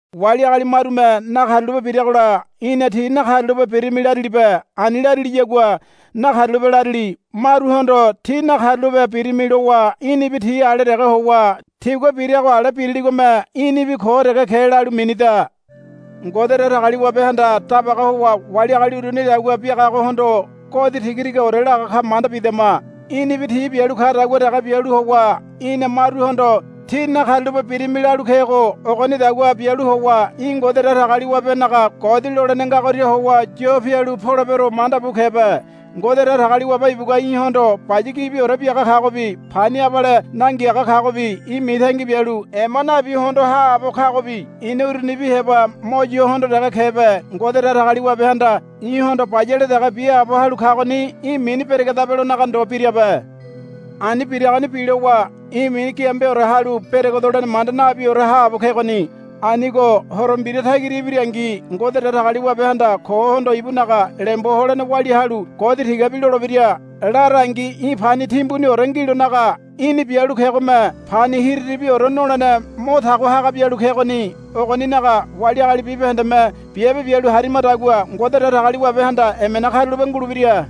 Wali agali marume nakarulape biragola í̠na tí nakarulape birimi larilibe. Ani lariliyagua nakarulape larili. Maruhondo tí nakarulape birimi lowa í̠nibi ti ale dege howa tigua birago ale biriligome í̠nibi ko dege ke lalu minida. Ngode Datagaliwabehanda dabaga howa wali agali urunidagua biagagohondo godi tigatigaore laga ka manda bidama. Í̠nibi ti bialu kadagua dege bialu howa í̠na maruhondo, Tí nakarulape birimi, lalu kego ogonidagua bialu howa í̠ Ngode Datagaliwabenaga godi lolene ngagoria howa yo pialu polebero manda bu kebe. Ngode Datagaliwabe ibugua í̠hondo baya gibiore biaga kagobi pani abale nangiaga kagobi í̠ mitangi bialu ema nabi hondo haabo kagobi í̠na urunibi heba mo yo hondo dege kebe. Ngode Datagaliwabehanda í̠hondo bayale dege biaabo halu kagoni í̠ mini beregedabelonaga ndo birabe. Ani biragoni bilowa í̠ mini giambeore halu beregedolene manda nabiore haabo kegoni. Anigo Horo Mbira tagira ibirangi Ngode Datagaliwabehanda kohondo ibunaga lembo holene walia halu godi tigabi lolebira. Larangi í̠ pani timbuniore ngilonaga í̠ni bialu kegome pani hiriribiore nolene mo tago haga bialu kegoni. Ogoninaga wali agali bibahendeme biabe bialu harimadagua Ngode Datagaliwabehanda emena karulape ngulebira.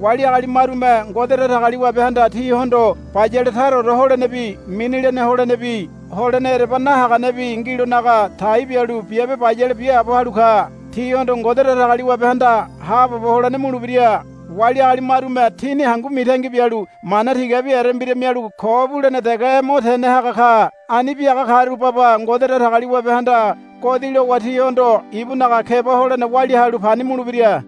Wali agali marume Ngode Datagaliwabehanda tihondo bayale taraore holenebi mini lene holenebi holene ereba nahaganebi ngilonaga tai bialu biabe bayale biaabo halu ka. Tihondo Ngode Datagaliwabehanda haabobo holene mulebira. Wali agali marume tini hangu mitangi bialu mana tigabi erembira mialu ko bulene dege mo tene haga ka. Ani biaga karu baba Ngode Datagaliwabehanda godi lowa tihondo ibunaga keba holene walia halu pani mulebira.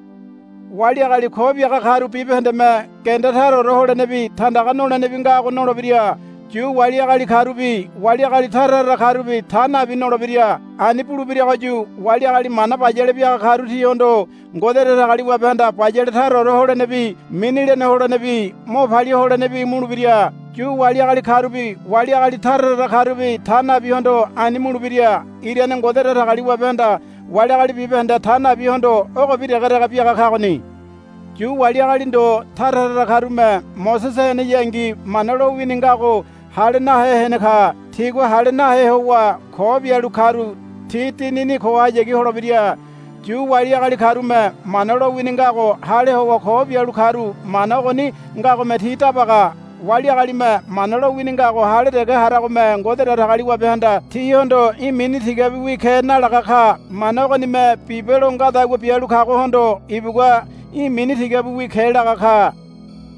Wali agali ko biaga karu bibahendeme genda taraore holenebi tandaga nolenebi ngago nolebira. Yu wali agali karubi wali agali tara tara karubi ta nabi nolebira. Ani bulebiragoyu wali agali mana bayale biaga karu tihondo Ngode Datagaliwabehanda bayale taraore holenebi mini lene holenebi mo palia holenebi mulebira. Yu wali agali karubi wali agali tara tara karubi ta nabihondo ani mulebira. Irane Ngode Datagaliwabehanda wali agali bibahende ta nabihondo ogobi degedege biaga kagoni. Yu wali agali ndo tara tara karume Mosese heneyangi Mana lowini ngago hale nahe hene ka. Tigua hale nahe howa ko bialu karu ti dinini kohayagi holebira. Yu wali agali karume Mana lowini ngago hale howa ko bialu karu mana ogoni ngagome ti dabaga. Wali agalime Mana lowini ngago hale dege haragome Ngode Datagaliwabehanda tihondo, Í̠ mini tigabiwi ke, nalaga ka. Mana ogonime bibe lo ngadagua bialu kagohondo ibugua, Í̠ mini tigabiwi ke, laga ka.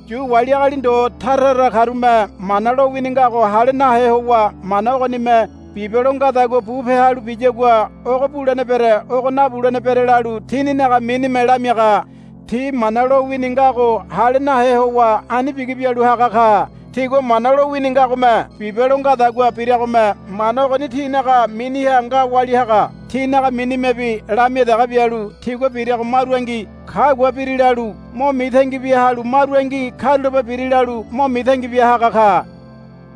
Yu wali agali ndo tara tara karume Mana lowini ngago hale nahe howa Mana ogonime bibe lo ngadagua bupe halu biyagua ogo bulene bere ogo nabulene bere lalu tininaga minime lamiaga. Ti Mana lowini ngago hale nahe howa ani bigi bialu haga ka. Tigua Mana lowini ngagome bibe lo ngadagua biragome mana ogoni tinaga miniha nga walia haga. Tinaga minimebi lamia dege bialu tigua birago marungi, Kagua biri, lalu mo mitangi bia halu marungi, Karulape biri, lalu mo mitangi bia haga ka.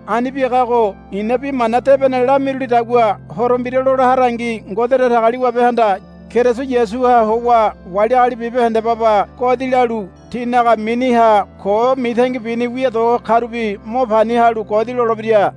Ani biagago i̱na Bi Mana Debene lamirulidagua Horo Mbira lola harangi Ngode Datagaliwabehanda Keriso Yasuha howa wali agali bibahende baba godi lalu tinaga miniha ko mitangi bini wia do karubi mo pani halu godi lolebira.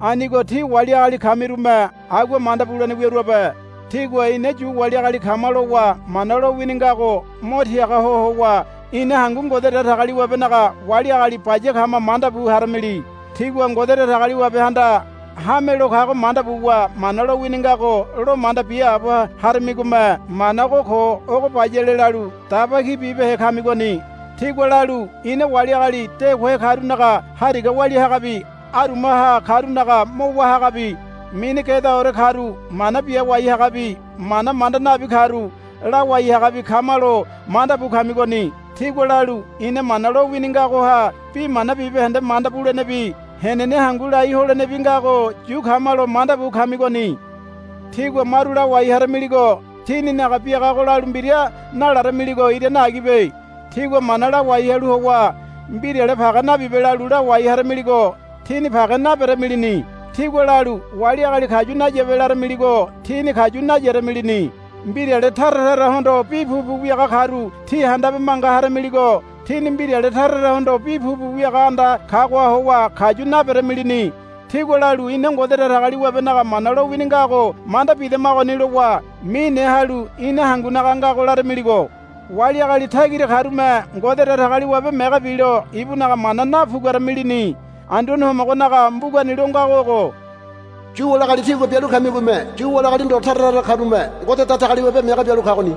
Anigo tí wali agali kamirume agua manda bulene wiaruabe. Tígua, Ina Yu wali agali kama, lowa Mana lowini ngago mo tiaga ho howa, Ina hangu Ngode Datagaliwabenaga wali agali baya kama, manda bu haramili. Tígua Ngode Datagaliwabehanda hamelo kago manda buwa Mana lowini ngago lo manda biaabo harimigome mana ogo ko ogo bayale lalu daba ki bibehe kamigoni. Tígua lalu, Ina wali agali de kohe karunaga hariga walia hagabi arumaha karunaga mo wá hagabi mini gedaore karu mana biawai hagabi mana manda nabi karu lawai hagabi kamalo, manda bu kamigoni. Tígua lalu, Ina Mana lowini ngagoha bi mana bibahende manda bulenebi henene hangu lai holenebi ngago yu kamalo, manda bu kamigoni. Tígua maru lawai haramiligo tíninaga biagago lalu mbira nalaramiligo irane agibe. Tígua mana lawai halu howa, Mbirale page nabibe, lalu lawai haramiligo tíni page naberamilini. Tígua lalu, Wali agali kayu nayabe, laramiligo tíni kayu nayaramilini. Mbirale tara tarahondo bi pupu wiaga karu tí handabe manga haramiligo tíni mbirale tara tarahondo bi pupu wiaga anda kagoha howa kayu naberamilini. Tígua lalu, Ina Ngode Datagaliwabenaga Mana lowini ngago manda bidamagoni, lowa mine halu, Ina hangunaga ngago, laramiligo. Wali agali tagira karume Ngode Datagaliwabe mege bilo ibunaga mana napuguaramilini. Anduane Homogonaga mbugani lo ngago ogo, Yu wali agali tígua bialu kamigome Yu wali agali ndo tara tara karume Ngode Datagaliwabe mege bialu kagoni,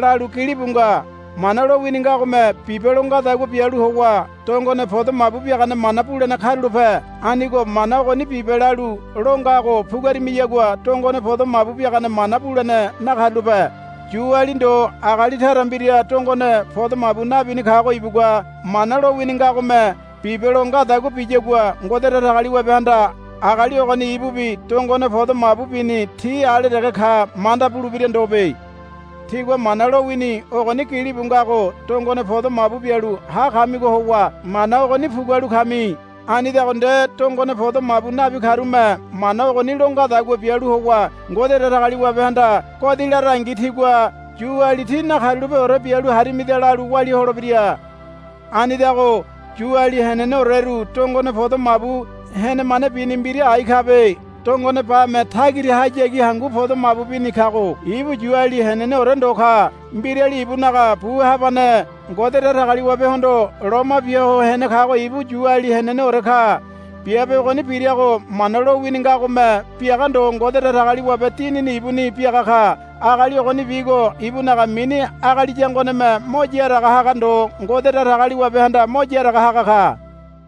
lalu gilibu nga. Mana lowini ngagome bibe lo ngadagua bialu howa dongone podo mabu biagane mana bulene karulape. Anigo Mana ogoni bibe lalu lo ngago puguarimiyagua dongone podo mabu biagane mana bulene nakarulape. Yuali ndo agali tara mbira dongone podo mabu nabini kago ibugua Mana lowini ngagome bibe lo ngadagua biyagua Ngode Datagaliwabehanda agali ogoni ibubi dongone podo mabu bini tí ale dege ka manda bulebira ndobe. Tígua Mana lowini ogoni gilibu ngago dongone podo mabu bialu ha kamigo howa Mana ogoni pugualu kami. Anidago nde dongone podo mabu nabi karume Mana ogoni lo ngadagua bialu howa Ngode Datagaliwabehanda godi larangi tigua, Yuali tí nakarulapeore bialu harimida, lalu walia holebira. Anidago Yuali heneneoreru dongone podo mabu henemane bini mbira ai kabe. Dongone bame tagirahayagi hangu podo mabu bini kago ibu Yuali heneneore ndo ka. Mbirali ibunaga bu habane Ngode Datagaliwabehondo loma bia ho hene kago ibu Yuali heneneore ka. Biabe ogoni birago Mana lowini ngagome biaga ndo Ngode Datagaliwabe Dinini ibuni biaga ka. Agali ogonibigo ibunaga mini agali yangoneme mo yaraga haga ndo Ngode Datagaliwabehanda mo yaraga haga ka.